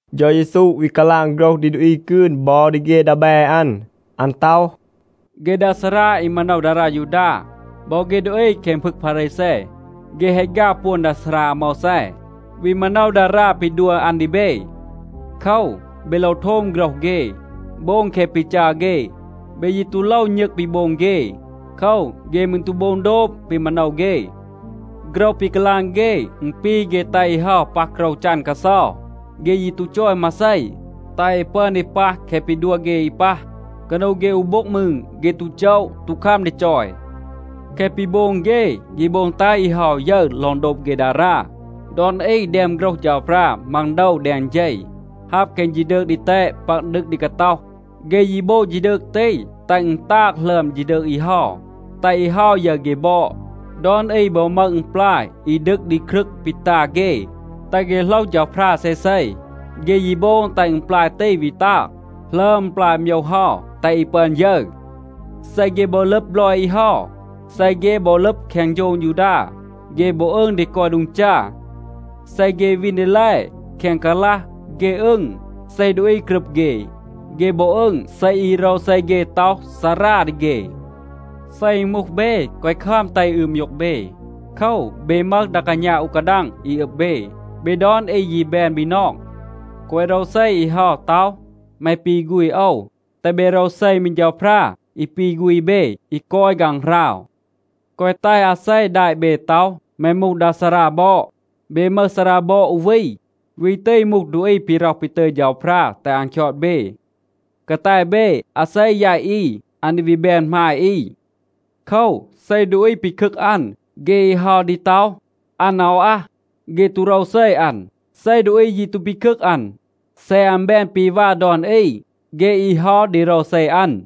เฌา เยซู วี กาลาง โฆรห ดี ดูอี กืน บอ ดี เฆ ดีแบ อัน. อัน ต็อห, “เฆ ดา ซารา อี มาโนว ดารา ยูดา บอ เฆ ดูอี แคง พึง พารีแซ, เฆ แฮะ ฆาว ปวน ดา ซารา อาโมวแซ, วี มาโนว ดารา ปี ดัว อัน ดี เบ. โคว, เบ โลว โทม โฆรห เฆ, โบง แคะ ปี จัร เฆ. เบ ยี ตู โลว ณึง ปี โบง เฆ. โคว, เฆ มืร ตู โบง โดบ ปี มาโนว เฆ. โฆรห ปี กาลาง เฆ, อึณ ปี เฆ แตห อี เฮา ปัห โกรว จัน กาเซา. เฆ ยี ตู จอย มาเซ, แตห อี ปึอน ดี ปัห แคะ ปี ดัว เฆ อี ปัห. กานู เฆ อู โบ็ง มืร เฆ ตู โจะ, ตู คัม ดี จอย. แคะ ปี โบง เฆ, เฆ โบง แตห อี เฮา ยึร ลอง โดบ เฆ ดารา. ดอน อี แดม โฆรห เฌาพรา มัง โดว แดง เฌ, ฮับ แคง ฌีดืก ดีแตด ปัก ดึก ดี กาต็อห. เฆ ยี โบง ฌีดืก ตี, แตห อึณ ตาง หลึอม ฌีดืก อี เฮา, แตห อี เฮา ยึร เฆ บอด. ดอน อี บอ มึห อึณปลาย อี ดึก ดี ครึง ปี ตา เฆ, แตห เฆ โหลห เฌาพรา เซเซ. เฆ ยี โบง แตห อึณปลาย ตี วี ตาง หลึอม อึณปลาย โมยว เฮา, แตห อี ปึอน ยึร. เซ เฆ บอ ลึบ บลอย อี เฮา, เซ เฆ บอ ลึบ แคง โฌง ยูดา, เฆ บอ อึง ดี กอย โดง จา. เซ เฆ วีน ดีแล แคง กาลัห, เฆ อึง, เซ ดูอี กรึบ เฆ. เฆ บอ อึง, เซ อี โรวเซ เฆ ต็อห, ‘ซารา’ ดี เฆ.a เซ อึณ มูห เบ, แกวะ คัม แตห อี อืบ มยูก เบ. โคว, เบ มึห ดา กาณา อู กาดัง อี อึบ เบ. เบ ดอน อี ยี แบน บีนอง. แกวะ โรวเซ อี เฮา, ต็อห, ‘แม ปี ฆูณ โอว.’ แตห เบ โรวเซ มี เฌาพรา, อี ปี ฆูณ เบ, อี กอย ฆางหราว. แกวะ แตห อาเซ แดะ เบ ต็อห, ‘แม มูห ดา ซารา บอด.’ เบ มึห ซารา บอด อู วี. วี ตี มูห ดูอี ปี ร็อห ปี ตึย เฌาพรา แตห อัน คยอด เบ. กาแต เบ, อาเซ แยต อี, อัน ดี วี แบน หมาย อี. โคว, เซ ดูอี ปีคึก อัน, เฆ อี เฮา ดี ต็อห, อัน อาว อัห. เฆ ตู โรวเซ อัน. เซ ดูอี ยี ตู ปีคึก อัน, เซ อัน แบน ปี วา ดอน อี, เฆ อี เฮา ดี โรวเซ อัน.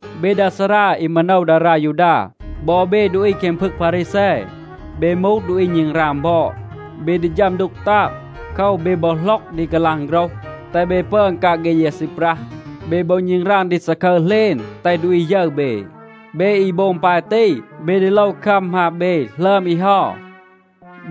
เบ ดา ซารา อี มาโนว ดารา ยูดา บอ เบ ดูอี แคง พึง พารีแซ, เบ มูห ดูอี ณึงราง บอด. เบ ดี ฌัม ดูก ตาง. โคว, เบ บอ หล็อก ดี กาลาง โฆรห, แตห เบ ปึอน กาง เฆ ยา ซีปรัห. เบ บอ ณึงราง ดี ซาคึร เหลณ, แตห ดูอี ยึร เบ. เบ อี โบง ปาย ตี, เบ ดี โลว คัม หมาบ เบ หลึอม อี เฮา.b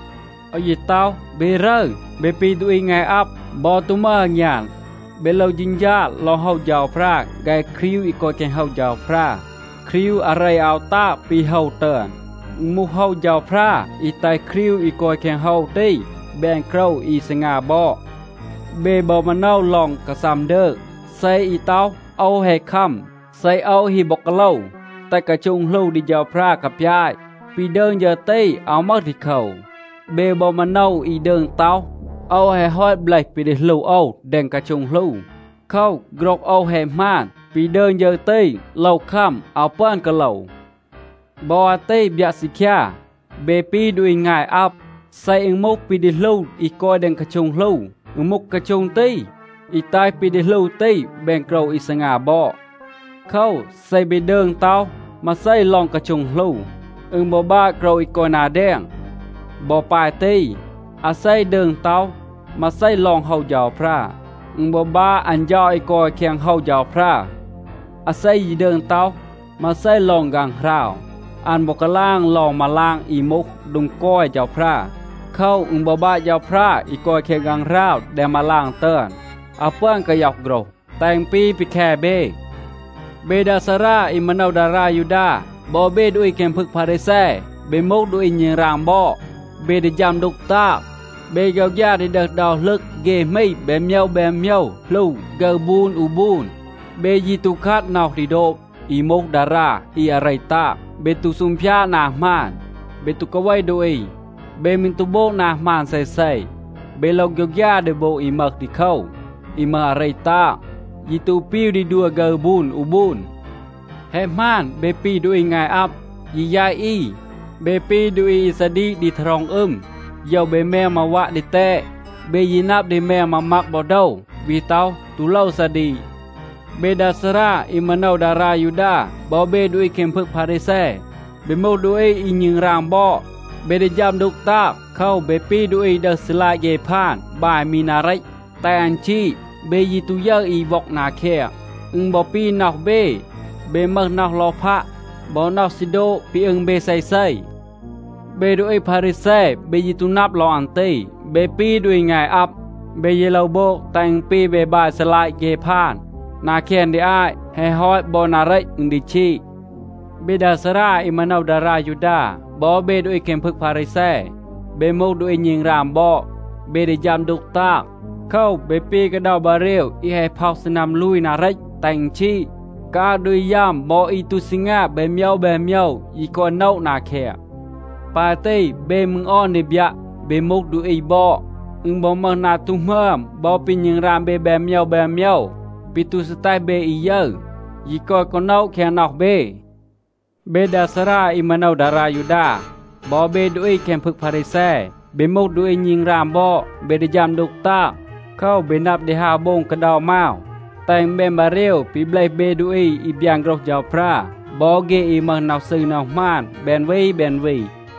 โอว ยี ต็อห, เบ รึร. เบ ปี ดูอี งาย อับ, บอ ตู มึห อางยาน. เบ โลว เฌณฌา ลอง โฮว เฌาพรา ฆาย ครีว อี กอย แคง โฮว เฌาพรา. ครีว อาเร อาว ตาง ปี โฮว ตึอน. อึณ มูห โฮว เฌาพรา อี แตห ครีว อี กอย แคง โฮว ตี แบน โกรว อี ซีงา บอด. เบ บอ มาโนว ลอง กาซัม ดืง, เซ อี ต็อห, ‘โอว แฮะ คัม, เซ โอว ฮี บอ กาโลว, แตห กาโช็ง หลู ดี เฌาพรา กาปยาต,’ ปี ดืง ฌึร ตี อาว มึห ดีโคว. เบ บอ มาโนว อี ดืง ต็อห, ‘โอว แฮะ ฮอต เบลห ปี ดี หลู โอว แดง กาโช็ง หลู. โคว, โฆรห โอว แฮะ หมาน, ปี ดืง ฌึร ตี, โลว คัม. อาว ปึอน กาโลว.’ บอ อาตี บยัะ ซีคยา, เบ ปี ดูอี งาย อับ. เซ อึณ มูห ปี ดี หลู อี กอย แดง กาโช็ง หลู, อึณ มูห กาโช็ง ตี, อี แตห ปี ดี หลู ตี แบน โกรว อี ซีงา บอด. โคว, เซ เบ ดืง ต็อห มาเซ ลอง กาโช็ง หลู, อึณ บอ บาะ โกรว อี กอย นา แดง. บอ ปาย ตี, อาเซ ดืง ต็อห มาเซ ลอง โฮว เฌาพรา, อึณ บอ บาะ อัน เฌา อี กอย แคง โฮว เฌาพรา. อาเซ ยี ดืง ต็อห มาเซ ลอง ฆางหราว, อัน บอ กาลาง ลอง มาลาง อี มูห โดง กอย เฌาพรา. โคว, อึณ บอ บาะ เฌาพรา อี กอย แคง ฆางหราว แดง มาลาง ตึอน. อาว ปึอน กาย็อห โฆรห, แตห อึณ ปี ปี แค เบ. เบ ดา ซารา อี มาโนว ดารา ยูดา บอ เบ ดูอี แคง พึง พารีแซ, เบ มูห ดูอี ณึงราง บอด. เบ ดี ฌัม ดูก ตาง. เบ โฆยวฆยา ดี ดึห เดา หลึง เฆ หมี แบน โมยว แบน โมยว, หลู ฆึร บูน อู บูน. เบ ยี ตู คัด น็อห ดี โดบ อี มูห ดารา อี อาเร ตาง. เบ ตู ซูงพยาด นา หมาน. เบ ตู กาเว ดูอี. เบ มืร ตู โบง นา หมาน เซเซ. เบ โลว โฆยวฆยา ดี โบง อี มึห ดีโคว, อี มึห อาเร ตาง, ยี ตู ปีว ดี ดัว ฆึร บูน อู บูน. แฮะ หมาน, เบ ปี ดูอี งาย อับ, ยี แยต อี. เบ ปี ดูอี อี ซาดีก ดี ทารอง อึม, โยว เบ แมง มาวัะ ดีแตด. เบ ยี นับ ดี แมง มามัก บอ โดว, วี ต็อห, ตู โลว ซาดีก. เบ ดา ซารา อี มาโนว ดารา ยูดา บอ เบ ดูอี แคง พึง พารีแซ, เบ มูห ดูอี อี ณึงราง บอด. เบ ดี ฌัม ดูก ตาง. โคว, เบ ปี ดูอี อี ดึห ซีลัยะ เฆ พาน, บาย มี นา เรต, แตห อัน ชีด. เบ ยี ตู ยึร อี ว็อง นา แคง. อึณ บอ ปี น็อห เบ. เบ มึห น็อห ลอพัะ บอ น็อห ซี โดบ ปี อึง เบ เซเซ. เบ ดูอี พารีแซ, เบ ยี ตู นับ ลอง อัน ตี. เบ ปี ดูอี งาย อับ. เบ ยี โลว โบง, แตห อึณ ปี เบ บาย ซีลัยะ เฆ พาน นา แคง ดี อาต. แฮะ ฮอต, บอ นา เรต อึณ ดี ชีด. เบ ดา ซารา อี มาโนว ดารา ยูดา บอ เบ ดูอี แคง พึง พารีแซ, เบ มูห ดูอี ณึงราง บอด. เบ ดี ฌัม ดูก ตาง. โคว, เบ ปี กาเดา บาเรว อี แฮะ พ็อห ซีนัม ลูย นา เรต, แตห อึณ ชีด. กาอาง ดูอี ยัม บอ อี ตู ซีงา แบน โมยว แบน โมยว ยี กอย โนะ นา แคง. ปาย ตี, เบ มืร ออน ดี บยัะ เบ มูห ดูอี บอด. อึณ บอ มึห นา ตู หมึอม บอ ปี ณึงราง เบ แบน โมยว แบน โมยว, ปี ตู ซี แตห เบ อี ยึร, ยี กอย กอ โนะ แคง น็อห เบ. เบ ดา ซารา อี มาโนว ดารา ยูดา บอ เบ ดูอี แคง พึง พารีแซ, เบ มูห ดูอี ณึงราง บอด. เบ ดี ฌัม ดูก ตาง. โคว, เบ นับ ดี ฮาว โบง กาเดา มาว, แตห อึณ แบน บาเรว ปี เบลห เบ ดูอี อี บยาน โฆรห เฌาพรา บอ เฆ อี มึห น็อห ซืร น็อห หมาน แบน วี แบน วี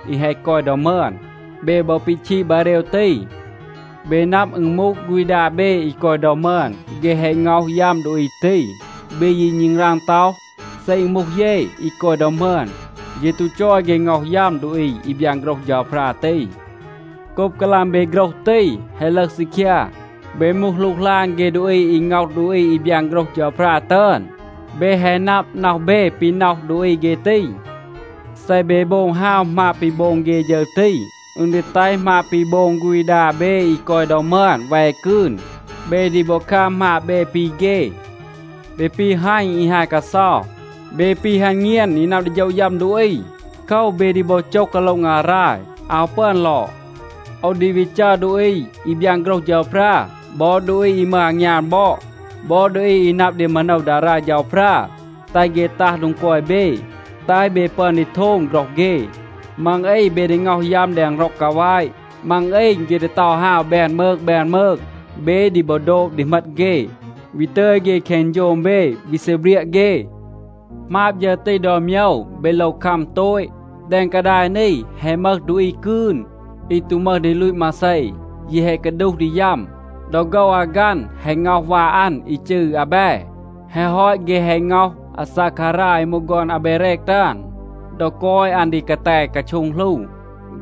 อี แฮะ กอย ดอ มึอน. เบ บอ ปีชีด บาเรว ตี. เบ นับ, อึณ มูห ฆูณ ดา เบ อี กอย ดอ มึอน, เฆ แฮะ ง็อห ยัม ดูอี ตี. เบ ยี ณึงราง ต็อห, ‘เซ อึณ มูห เย อี กอย ดอ มึอน, เย ตู จอย เฆ ง็อห ยัม ดูอี อี บยาน โฆรห เฌาพรา ตี.’ โกบ กาลาง เบ โฆรห ตี, แฮะ ลึห ซีคยา, เบ มูห หลูกหลาน เฆ ดูอี อี ง็อห ดูอี อี บยาน โฆรห เฌาพรา ตึอน. เบ แฮะ นับ, น็อห เบ ปี น็อห ดูอี เฆ ตี. เซ เบ โบง ฮาว หมาบ ปี โบง เฆ ฌึร ตี, อึณ ดี แตห หมาบ ปี โบง ฆูณ ดา เบ อี กอย ดอ มึอน แว กืน. เบ ดี บอ คัม หมาบ เบ ปี เฆ. เบ ปี ฮัณ อี ฮาย กาเซา. เบ ปี ฮัณ เงียน อี นับ ดี โฌะ ยัม ดูอี. โคว, เบ ดี บอ โจห กาโละ งาราย. อาว ปึอน ลอด. โอว ดี วี จัร ดูอี อี บยาน โฆรห เฌาพรา บอ ดูอี อี มึห อางยาน บอด บอ ดูอี อี นับ ดี มาโนว ดารา เฌาพรา, แตห เฆ ตัห โดง กอย เบ, แตห เบ ปึอน ดี โทม โฆรห เฆ. มัง อี, เบ ดี ง็อห ยัม แดง ร็อง กาแวะ. มัง อี เฆ ดี เตา ฮาว แบน มืง แบน มืง. เบ ดี บอ โดบ ดี เหมต เฆ, วี ตึย เฆ แคง โฌง เบ, วี ซีเบรียะ เฆ. หมาบ ฌึร ตี ดอน โมยว, เบ โลว คัม โตต. แดง กาดาย นี แฮะ มึห ดูอี กืน, อี ตู มึห ดี ลูต มาเซ, ยี แฮะ กาดูห ดี ยัม. ดอ โฆว อากัณ แฮะ ง็อห วา อัน อี จืร อาแบ. แฮะ ฮอต, เฆ แฮะ ง็อห อาซาคารา อี มูห ฆอน อาเบเรก ตึอน ดอ กอย อัน ดี กาแต กาโช็ง หลู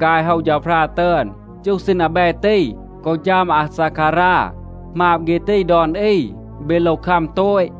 ฆาย โฮว เฌาพรา ตึอน. จูห ซีณ อาแบ ตี กอ ฌัม อาซาคารา, หมาบ เฆ ตี ดอน อี, เบ โลว คัม โตต.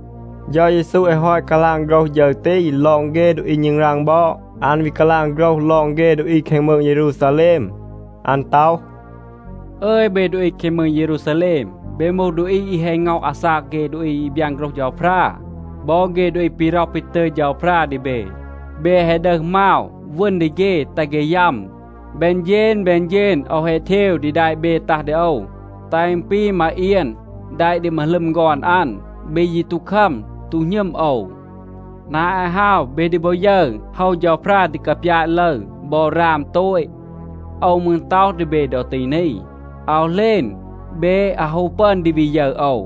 เฌา เยซู แฮะ ฮอต กาลาง โฆรห ฌึร ตี ลอง เฆ ดูอี ณึงราง บอด, อัน วี กาลาง โฆรห ลอง เฆ ดูอี แคง มืง เยรูซาแลม. อัน ต็อห, “อึย เบ ดูอี แคง มืง เยรูซาแลม, เบ มูห ดูอี อี แฮะ ง็อห อาซาก เฆ ดูอี อี บยาน โฆรห เฌาพรา. บอ เฆ ดูอี ปี ร็อห ปี ตึย เฌาพรา ดี เบ, เบ แฮะ ดึห มาว, วึณ ดี เฆ แตห เฆ ยัม. แบน เฌณ แบน เฌณ โอว แฮะ เทว ดี แดะ เบ ตัห ดี โอว, แตห อึณ ปี มาเอียน แดะ ดี มาหลึม ฆอน อัน. เบ ยี ตู คัม, ตู หณึม โอว. นา อาต ฮาว, เบ ดี บอ ยึร, โฮว เฌาพรา ดี กาปยาต ลึร, บอ ราม โตต. โอว มืร ต็อห ดี เบ ดอ ตี นี, อาว เหลณ เบ อาว ฮู ปึอน ดี วี ยึร โอว.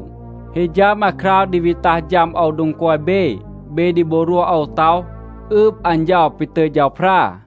ฮี ฌัม อาคราว ดี วี ตัห ฌัม โอว โดง กอย เบ, เบ ดี บอ รวห โอว ต็อห, ‘อืบ อัน เฌา ปี ตึย เฌาพรา.’”